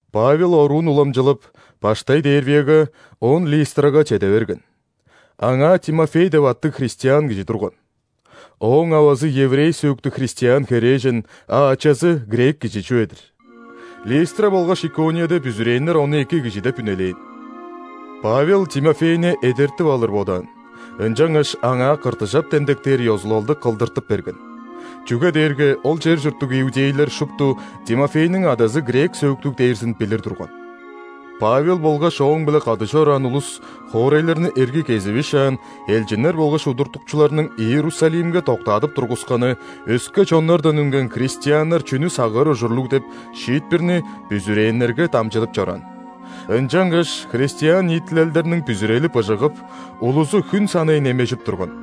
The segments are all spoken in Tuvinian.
Павел оруун уламчылап, баштай Дервияга, оон Листрага чеде берген. Аңаа Тимофей деп аттыг христиан кижи турган. Ооң авазы – еврей сөөктүг христиан херээжен, а ачазы – грек кижи чүве-дир. Листра болгаш Иконияда бүзүрээннер ону эки кижи деп үнелээн. Павел Тимофейни эдертип алыр бодаан, ынчангаш аңаа ·кыртыжап демдектээр ёзулалды кылдыртып берген. Чүге дээрге ол чер чурттуг иудейлер шупту Тимофейниң адазы грек сөөктүг дээрзин билир турган. Павел болгаш ооң-биле кады чораан улус хоорайларны эргий кезивишаан, элчиннер болгаш удуртукчуларның Иерусалимге доктаадып тургусканы – өске чоннардан үнген христианнар чүнү сагыыр ужурлугул деп шиитпирни бүзүрээннерге дамчыдып чораан. Ынчангаш христиан ниитилелдерниң бүзүрели быжыгып, улузу хүн санай немежип турган.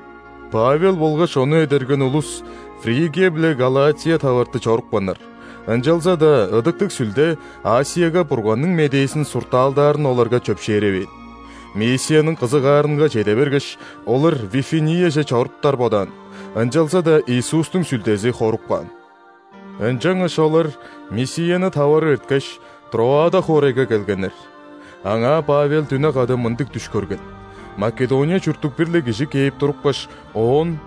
Павел болгаш ону эдерген улус Фригия биле Галатия таварты чорупканнар, ынчалза-даа Ыдыктыг Сүлде ·Асияга Бурганның медээзин суртаалдаарын оларга чөпшээревээн. Мисияның кызыгаарынга чеде бергеш, олар Вифинияже чоруптар бодаан, ынчалза-даа Иисустуң Сүлдези хоруп каан. Ынчангаш олар Мисияны таварып эрткеш, Троада хоорайга келгеннер. Аңаа Павел дүне када мындыг дүш көрген: Македония чурттуг бир-ле кижи кээп турупкаш, оон: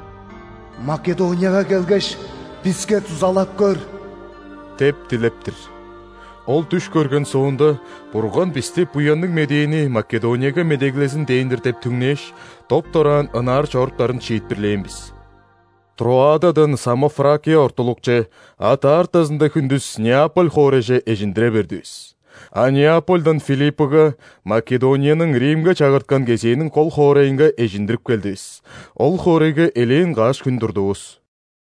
«Македонияга келгеш, биске дузалап көр!» – деп дилеп-тир. Ол дүш көрген соонда, Бурган бисти Буянныг Медээни Македонияга медеглезин дээн-дир деп түңнээш, доп-дораан ынаар чоруптарын шиитпирлээн бис. Троададан Самофракия ортулукче, а даартазында хүндүс Неаполь хоорайже эжиндире бердивис. А Неапольдан Филиппыга – Македонияның Римге чагырткан кезээниң кол хоорайынга эжиндирип келдивис. Ол хоорайга элээн каш хүн турдувус.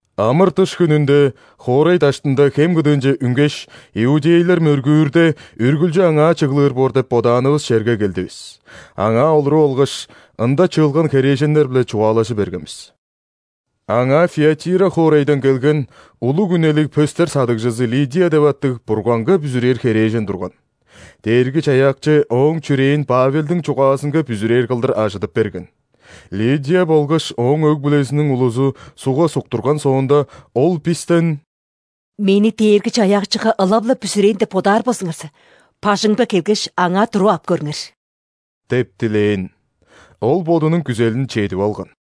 Амыр-дыш хүнүнде хоорай даштында хем кыдыынче үнгеш, иудейлер мөргүүрде, үргүлчү аңаа чыглыр боор деп бодаанывыс черге келдивис. Аңаа олуруп алгаш, ында чыылган херээженнер-биле чугаалажы берген бис. Аңаа Фиатира хоорайдан келген, улуг үнелиг пөстер садыгжызы Лидия деп аттыг Бурганга бүзүрээр херээжен турган. Дээрги-Чаяакчы ооң чүрээн Павелдиң чугаазынга бүзүрээр кылдыр ажыдып берген. Лидия болгаш ооң өг-бүлезиниң улузу ·сугга суктурган соонда, ол бистен: «Мени Дээрги-Чаяакчыга ылап-ла бүзүрээн деп бодаар болзуңарза, бажыңымга келгеш, аңаа туруп ап көрүңер» – деп дилээн. Ол бодунуң күзелин чедип алган.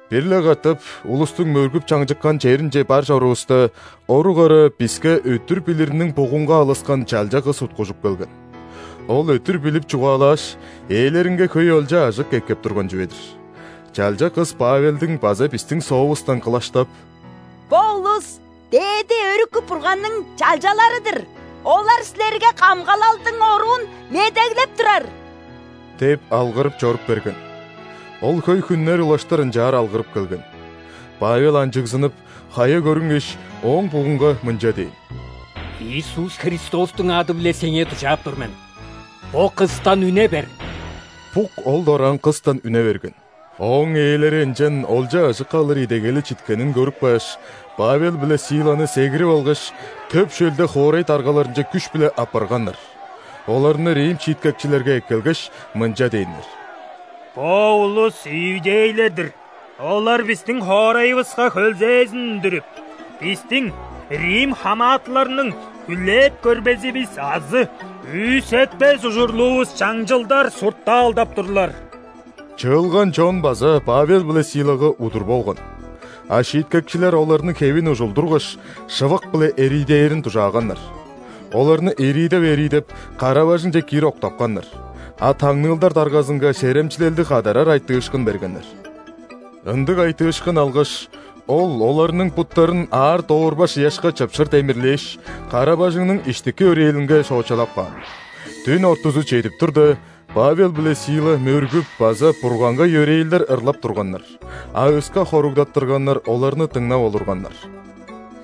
Бир-ле катап улустуң мөргүп чаңчыккан черинче бар чорувуста, орук ара биске өттүр билириниң бугунга алыскан чалча кыс уткужуп келген. Ол өттүр билип чугаалааш, ээлеринге хөй олча-ажык эккеп турган чүве-дир. Чалча кыс Павелдиң база бистиң соовустан кылаштап: «Бо улус – Дээди Өрүкү Бурганның чалчалары-дыр! Олар силерге камгалалдың оруун медеглеп турар!» – деп алгырып чоруп берген. Ол хөй хүннер улаштыр ынчаар алгырып келген. Павел анчыгзынып, хая көрүнгеш, ооң бугунга мынча дээн: «Иисус Христостуң ады-биле сеңээ дужаап тур мен – бо кыстан үне бер!» Бук ол дораан кыстан үне берген. Ооң ээлери ынчан олча-ажык алыр идегели читкенин көрүп кааш, Павел биле Силаны сегирип алгаш, төп шөлде хоорай даргаларынче күш-биле аппарганнар. Оларны рим шииткекчилерге эккелгеш, мынча дээннер: «Бо улус иудейлер-дир, олар бистиң хоорайывыска хөлзээзин үндүрүп, бистиң, рим хамаатыларның, хүлээп көрбезивис азы күүсетпес ужурлуувус чаңчылдар суртаалдап турлар». Чыылган чон база Павел биле Силага удур болган. А шииткекчилер оларның хевин ужулдургаш, шывык-биле эриидээрин дужааганнар. Оларны эриидеп-эриидеп, кара-бажыңче киир октапканнар, а таңныылдар даргазынга серемчилелдиг кадарар айтыышкын бергеннер. Ындыг айтыышкын алгаш, ол оларның буттарын аар доорбаш ыяшка чыпшыр демирлээш, кара-бажыңның иштики өрээлинге шоочалап каан. Дүн ортузу чедип турда, Павел биле Сила мөргүп база Бурганга йөрээлдер ырлап турганнар, а өске хоругдаттырганнар оларны дыңнап олурганнар.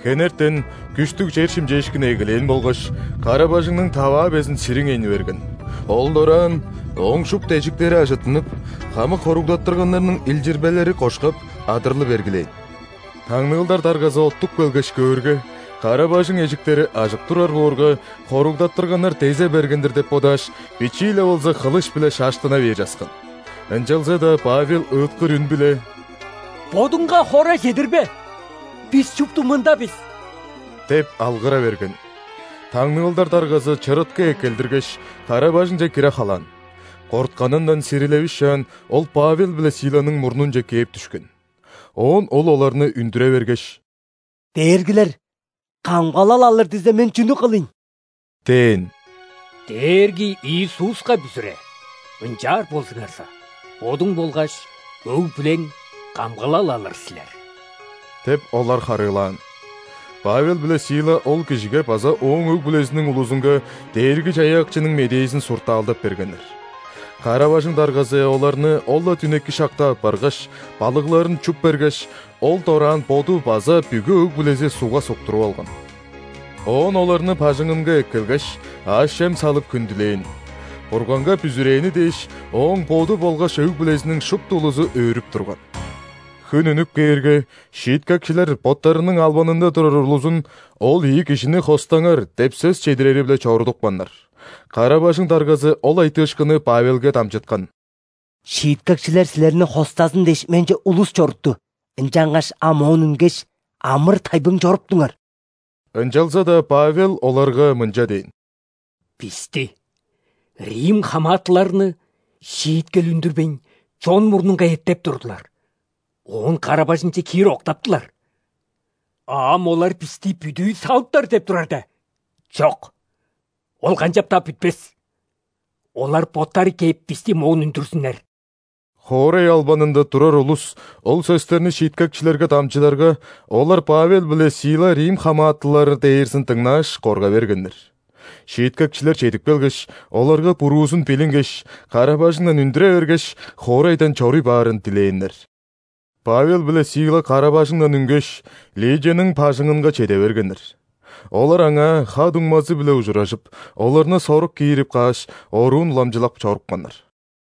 Хенертен күштүг чер шимчээшкини эгелээн болгаш, кара-бажыңның таваа безин сириңейни берген, ол дораан ооң шупту эжиктери ажыттынып, хамык хоругдаттырганнарның илчирбелери кошкап, адырлы бергилээн. Таңныылдар даргазы оттуп келгеш, көөрге, кара-бажың эжиктери ажык турар боорга, хоругдаттырганнар дезе берген-дир деп бодааш, бичии-ле болза хылыш-биле шаштына бер часкан. Ынчалза-даа Павел ыыткыр үн-биле: «Бодуңга хора чедирбе! Бис шупту мында бис!» – деп алгыра берген. Таңныылдар даргазы чырыткы эккелдиргеш, кара-бажыңче кире халаан. Кортканындан сирилевишаан, ол Павел биле Силаның мурнунче кээп дүшкен. Оон ол оларны үндүре бергеш: «Дээргилер, камгалал алыр дизе, мен чүнү кылыйн?» – дээн. «Дээрги Иисуска бүзүре. Ынчаар болзуңарза, бодуң болгаш өг-бүлең камгалал алыр силер» – деп, олар харыылаан. Павел биле Сила ол кижиге база ооң өг-бүлезиниң улузунга Дээрги-Чаяакчының медээзин суртаалдап бергеннер. Кара-бажың даргазы оларны ол-ла дүнеки шакта аппаргаш, балыгларын чуп бергеш, ол дораан боду база бүгү өг-бүлези ·сугга суктуруп алган. Оон оларны бажыңынга эккелгеш, аъш-чем салып хүндүлээн. Бурганга бүзүрээни дээш, ооң боду болгаш өг-бүлезиниң шупту улузу өөрүп турган. Хүн үнүп кээрге, шииткекчилер боттарының албанында турар улузун: «Ол ийи кижини хостаңар» – деп сөс чедирери-биле чорудупканнар. Кара-бажың даргазы ол айтыышкынны Павелге дамчыткан: «Шииткекчилер силерни хостазын дээш, менче улус чорутту. Ынчангаш ам моон үнгеш, амыр-тайбың чоруптуңар». Ынчалза-даа Павел оларга мынча дээн: «Бисти, рим хамаатыларны, шииткел үндүрбейн, чон мурнунга эттеп турдулар, оон кара-бажыңче киир октаптылар. А ам олар бисти бүдүү салыптар деп турар де? Чок! Ол канчап-даа бүтпес! Олар боттары кээп, бисти моон үндүрзүннер». Хоорай албанында турар улус ол сөстерни шииткекчилерге дамчыдарга, олар Павел биле Сила рим хамаатылар дээрзин дыңнааш, корга бергеннер. Шииткекчилер чедип келгеш, оларга буруузун билингеш, кара-бажыңдан үндүре бергеш, хоорайдан чоруй баарын дилээннер. Павел биле Сила кара-бажыңдан үнгеш, Лидияның бажыңынга чеде бергеннер. Олар аңаа ха-дуңмазы-биле ужуражып, оларны сорук киирип кааш, оруун уламчылап чорупканнар.